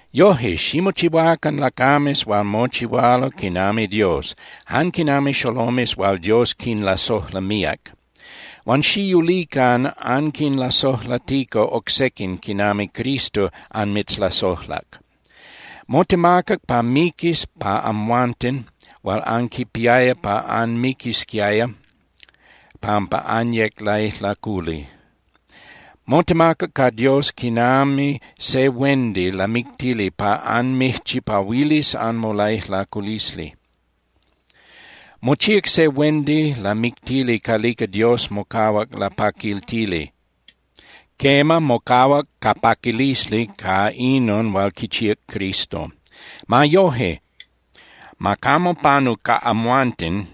Yoje, ximochihuacan lacames hual mochihualo quinami Dios, jan quinami xolomes hual Dios quinlasojla míac. Huan xiyulican anquinlasojlatica oc sequin quinami Cristo anmitzlasojlac. Motemacac pa miquis pa amhuanten hual anquipiaya pa anmiquisquiaya pampa anyec laijlaculi. Motemacac ca Dios quinami se huendi lamictili pa anmijchipahuilis anmolaijlaculisli. Mochíac se huendi lamictili calica Dios mocahuac lapaquiltili. Quema, mocahuac ca paquilisli ca inon hual quichíac Cristo. Ma yoje, ma camo panu ca amhuanten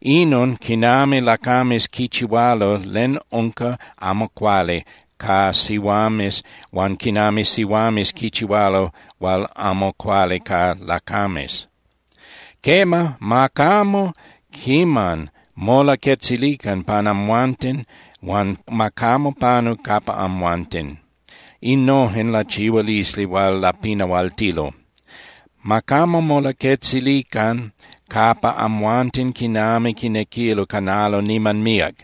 inon quinami lacames quichihualo len unca amo cuali ca sihuames huan quinami sihuames quichihualo hual amo cuali ca lacames. Quema, ma camo quiman molaquetzilican pan amhuanten, huan ma camo panu capa amhuanten innojen lachihualisli hual lapinahualtilo. Ma camo molaquetzilican capa amhuanten quinami quinequilo canalo niman míac.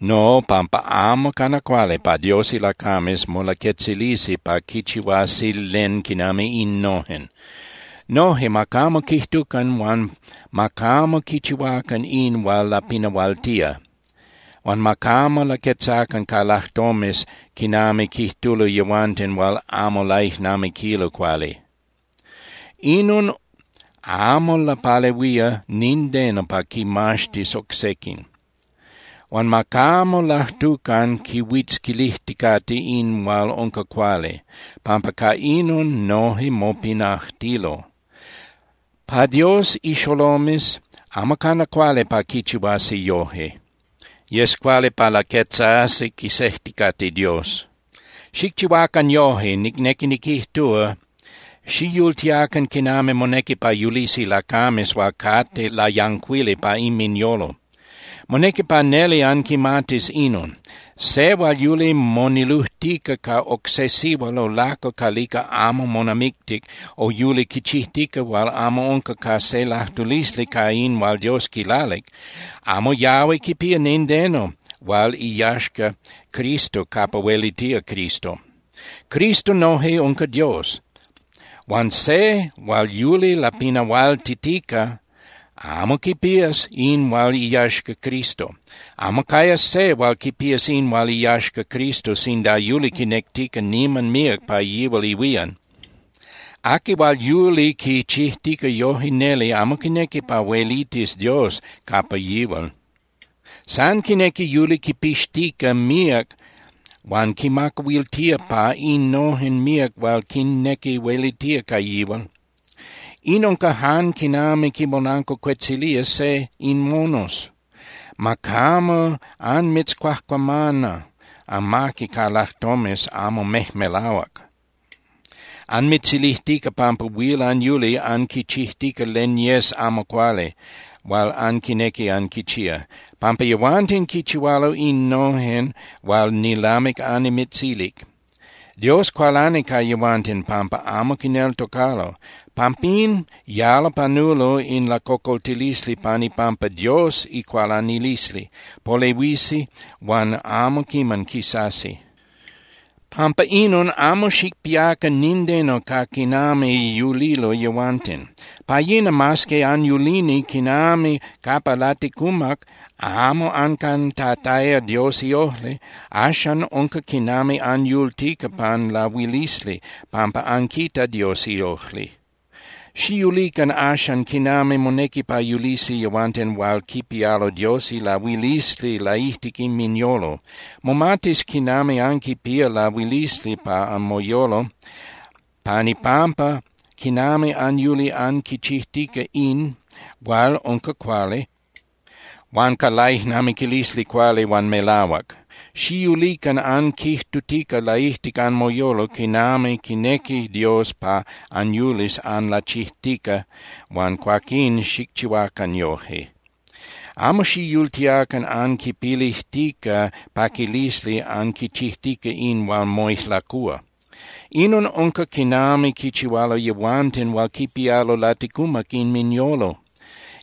No, pampa amo cana cuali pa Dios ilacames molaquetzilisi pa quichihuasi len quinami innojen. Noje ma camo quijtucan huan ma camo quichihuacan in hual lapinahualtía, huan ma camo laquetzacan ca lajtomes quinami quijtulo yehuanten hual amo laijnamiquilo cuali. Inon amo lapalehuía nindeno pa quimaxtis oc sequin. Huan ma camo lajtucan quihuitzquilijticate in hual unca cuali, pampa ca inon noje mopinajtilo. Pa Dios ixolomes amo cana cuali pa quichihuasi yoje. Yes cuali pa laquetzasi quisejticate Dios. Xicchihuacan yoje, nicnequi niquijtúa, xiyultiacan quinami monequi pa yulisi lacames hual cate layancuili pa inminyolo. Monequi pa neli anquimatis inon: Se hual yuli monilujtica ca oc se sihual o lacal calica amo monamictic o yuli quichijtica hual amo unca ca se lajtulisli ca in hual Dios quilalic, amo yahui quipía nindeno hual iyaxca Cristo capa huelitía Cristo. Cristo noje unca Dios. Huan se hual yuli lapinahualtitica amo quipías in hual iyaxca Cristo. Amo cayas se hual quipías in hual iyaxca Cristo sinda yuli quinectica niman míac pa yihual ihuían. Aqui hual yuli quichijtica yoje neli amo quinequi pa huelitis Dios capa yihual. San quinequi yuli quipixtica míac huan quimacahuiltía pa innojen míac hual quinnequi huelitía ca yihual. In unca jan quinami quimolancuacuetzilía se in monos. Ma camo anmitzcuajcuamana amaqui ca lajtomes amo mejmelahuac, anmitzilijtica pampa huil anyuli anquichijtica len yes amo cuali hual anquinequi anquichía, pampa yehuanten quichihualo innojen hual nilamic annimitzilic. Dios cualani ca yehuanten pampa amo quineltocalo. Pampín yalo panulo in lacocoltilisli pan ipampa Dios icualanilisli, polehuisi huan amo quiman quisasi. Pampa inon, amo xicpiacan nindeno ca quinami yulilo yehuanten. Pa yina mas que anyulini quinami capa laticumac amo ancantataya Dios iojli, axan unca quinami anyultica pan lahuilisli, pampa anquitac Dios iojli. Xiyulican axan quinami monequi pa yulisi yehuanten hual quipialo Dios ilahuilisli laijtic inminyolo. Momatis quinami anquipía lahuilisli pa anmoyolo pan ipampa quinami anyuli anquichijtica in hual unca cuali huan ca laijnamiquilisli cuali huan melahuac. Xiyulican anquijtutica laijtic anmoyolo quinami quinequi Dios pa anyulis anlachijtica huan cuaquín xicchihuacan yoje. Amo xiyultiacan anquipilijtica paquilisli anquichijtica in hual moijlacúa. Inon unca quinami quichihualo yehuanten hual quipialo laticumac inminyolo.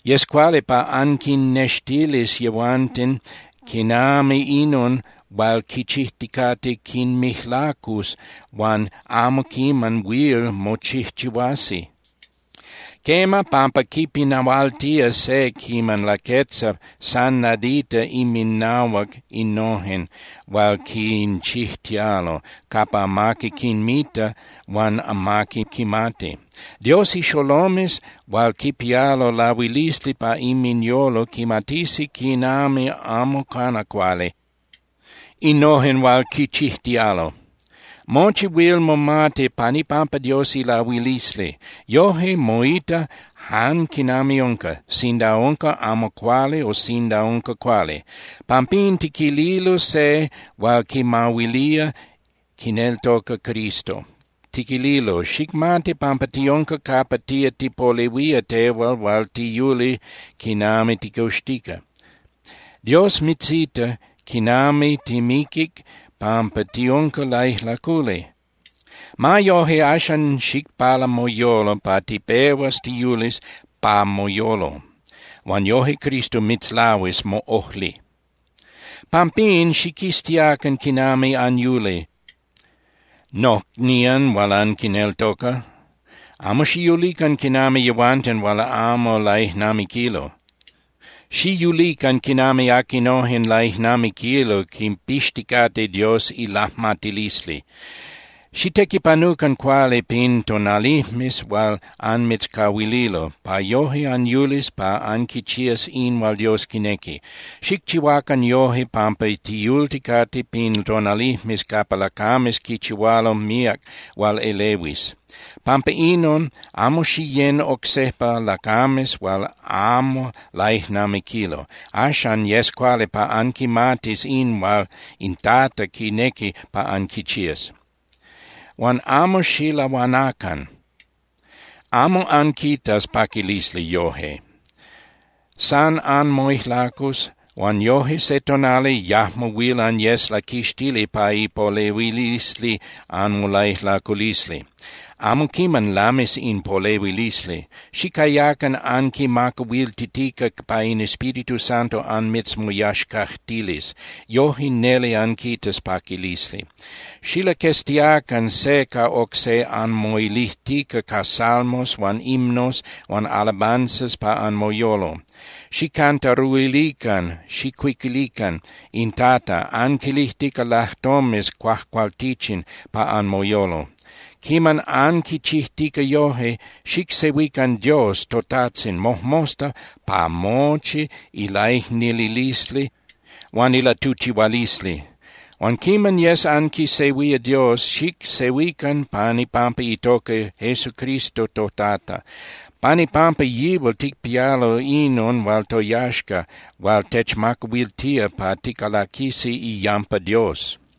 Yes cuali pa anquinnextilis yehuanten quinami inon hual quichijticate quinmijlacus huan amo quiman huil mochijchihuasi. Quema, pampa quipinahualtía se quiman laquetza san nadita inminahuac innojen hual quinchijtialo capa amaqui quinmita huan amaqui quimati. Dios ixolomes hual quipialo ilahuilisli pa inminyolo quimatisi quinami amo cana cuali innojen hual quichijtialo. Mochi huil momati pan ipampa Dios ilahuilisli. Yoje moita jan quinami unca, sinda unca amo cuali o sinda unca cuali. Pampín, tiquililo se hual quimahuilía quineltoca Cristo, tiquililo: Xicmati pampa tiunca capa tía tipolehuía tehual hual tiyuli quinami ticoxtica. Dios mitzita quinami timiquic pampa tiunca laijlaculi. Ma yoje, axan xicpala moyolo pa tipehuas tiyulis pa moyolo, huan yoje Cristo mitzlahuis moꞌojli. Pampín, xiquiztiacan quinami anyuli, nocnían hual anquineltoca. Amo xiyulican quinami yehuanten hual amo laijnamiquilo. Xiyulican quinami aquinojen laijnamiquilo quipixticate Dios ilajmatilisli. Xitequipanucan cuali pin tonalijmes hual anmitzcahuililo, pa yoje anyulis pa anquichías in hual Dios quinequi. Xicchihuacan yoje pampa tiyulticate pin tonalijmes capa lacames quichihualo míac hual elehuis. Pampa inon, amo xiyén oc sejpa lacames hual amo laijnamiquilo. Axan yes cuali pa anquimatis in hual in Tata quinequi pa anquichías. Huan amo xilahuanacan. Amo anquitas paquilisli yoje. San anmoijlacus huan yoje se tonali yajmo huil anyes laquixtili pa ipolehuilisli anmolaijlaculisli. Amo quiman lamis in polehuilisli. Xicayacan anquimacahuiltitica pa in Espíritu Santo anmitzmoyaxcajtilis, yoje neli anquitas paquilisli. Xilaqueztiacan se ca oc se anmoilijtica ca salmos huan himnos huan alabanzas pa anmoyolo. Xijcantaruilican (xijcuiquilican) in Tata anquilijtica lajtomes cuajcualtichin pa anmoyolo. Quiman anquichijtica yoje, xicsehuican Dios toTajtzin mojmosta pa mochi ilaicnililisli huan ilatuchihualisli. Huan quiman yes anquisehuía Dios, xicsehuican pan ipampa itoca Jesucristo toTata. Pan ipampa yihual ticpialo inon hual toyaxca hual techmacahuiltía pa ticalaquisi iyampa Dios.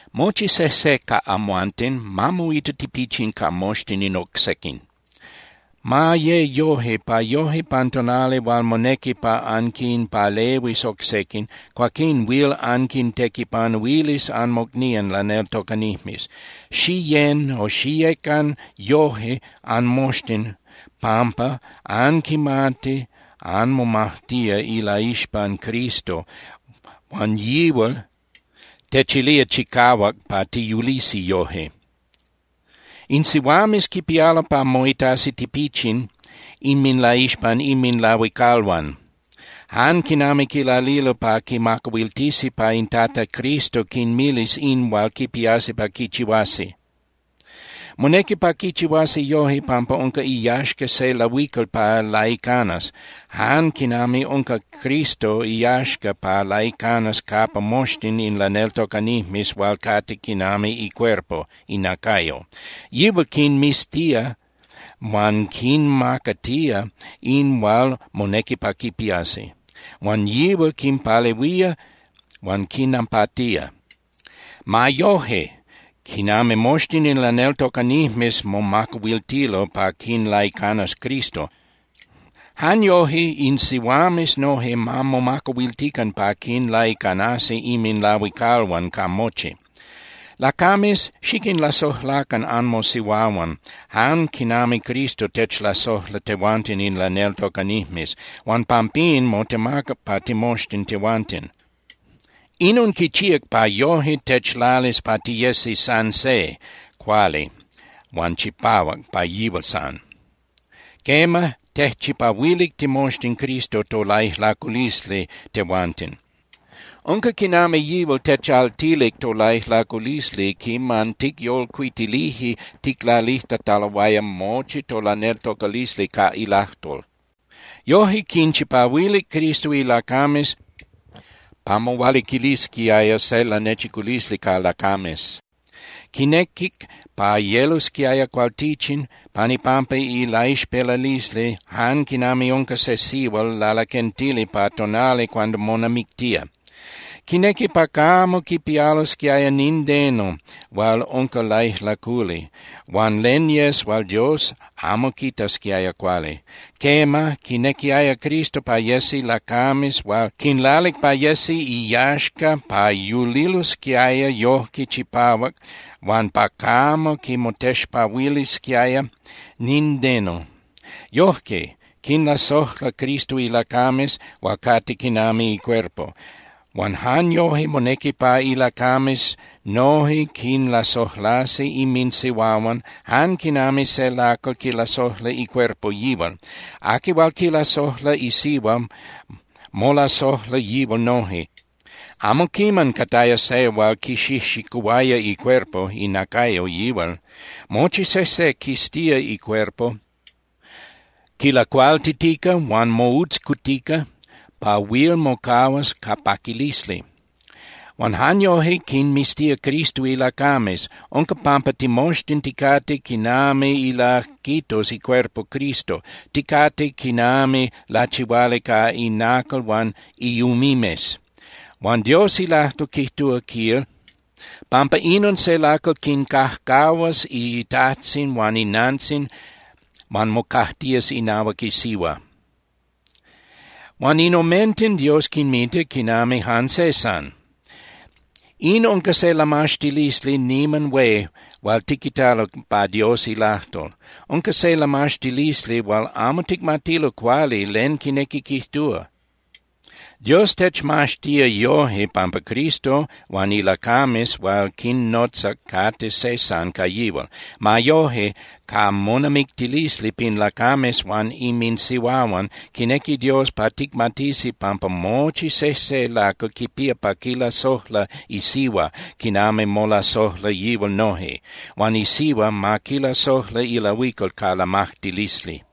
Mochi sejse ca amhuanten ma moita tipichin ca moxtin in oc sequin. Ma ye yoje, pa yoje pan tonali hual monequi pa anquinpalehuis oc sequin, cuaquín huil anquintequipanuilis anmocnían laneltocanijmes. Xiyén (xiyecan) yoje anmoxtin pampa anquimati anmomajtía ilaixpan Cristo huan yihual techilía chicahuac pa tiyulisi yoje. In sihuames quipialo pa moitasi tipichin inminlaixpan inminlahuicalhuan, jan quinami quilalilo pa quimacahuiltisi pa in Tata Cristo quinmilis in hual quipiasi pa quichihuasi. Monequi pa quichihuasi yoje pampa unca iyaxca se lahuical pa laicanas, jan quinami unca Cristo iyaxca pa laicanas capa moxtin in laneltocanijmes hual cate quinami icuerpo (inacayo). Yihual quinmiztía huan quinmacatía in hual monequi pa quipiasi. Huan yihual quinpalehuía huan quinnapatía. Ma yoje, quinami moxtin in laneltocanijmes momacahuiltilo pa quinlaicanas Cristo, jan yoje in sihuames noje ma momacahuiltican pa quinlaicanasi inminlahuicalhuan ca mochi. Lacames, xiquinlasojlacan anmosihuahuan jan quinami Cristo techlasojla tehuanten in laneltocanijmes, huan pampín motemacac pa timoxtin tehuanten. Inon quichíac pa yoje techlalis pa tiyesi san se, cuali huan chipahuac pa yihual san. Quema, tejchipahuilic timoxtin Cristo tolaijlaculisli tehuanten. Unca quinami yihual techaltilic tolaijlaculisli quiman ticyolcuitilije ticlalijtataloaya mochi tolaneltocalisli ca ilajtol. Yoje quinchipahuilic Cristo ilacames pa mohualiquilisquiaya se lanechiculisli ca lacames. Quinequic pa yelosquiaya cualtichin pan ipampa ilaixpelalisli jan quinami unca se sihual lalaquentili pan tonali hual monamictía. Quinequi pa camo quipialosquiaya nindeno hual unca laijlaculi huan len yes hual Dios amo quitasquiaya cuali. Quema, quinequiaya Cristo pa yesi lacames hual quinlalic pa yesi iyaxca pa yulilosquiaya yojque chipahuac huan pa camo quinmotexpahuilisquiaya nindeno. Yojque quinlasojla Cristo ilacames hual cate quinami icuerpo. Huan jan yoje monequi pa ilacames noje quinlasojlasi inminsihuahuan jan quinami se lacal quilasojla icuerpo yihual. Aqui hual quilasojla isihua molasojla yihual noje. Amo quiman cataya se hual quixijxicuhuaya icuerpo (inacayo) yihual. Mochi sejse quiztía icuerpo, quilacualtitica huan moutzcutica pa huil mocahuas ca paquilisli. Huan jan yoje quinmiztía Cristo ilacames. Unca pampa timoxtin ticate quinami ilajquitos icuerpo Cristo, ticate quinami lachihuali ca inacal huan iumimes. Huan Dios ilajtol quijtúa, quil: “Pampa inon se lacal quicajcahuas itajtzin huan inantzin huan mocajtías inahuac isihua. Huan in omenten Dios quinmita quinami jan se san.” In unca se lamaxtilisli niman hué hual tiquitalo pa Dios ilajtol. Unca se lamaxtilisli hual amo ticmatilo cuali len quinequi quijtúa. Dios techmaxtía yoje pampa Cristo huan ilacames hual quinnotzac cate se san ca yihual. Ma yoje, ca monamictilisli pin lacames huan inminsihuahuan, quinequi Dios pa ticmatisi pampa mochi sejse lacal quipía pa quilasojla isihua quinami molasojla yihual noje. Huan isihua ma quilasojla ilahuical ca lamajtilisli.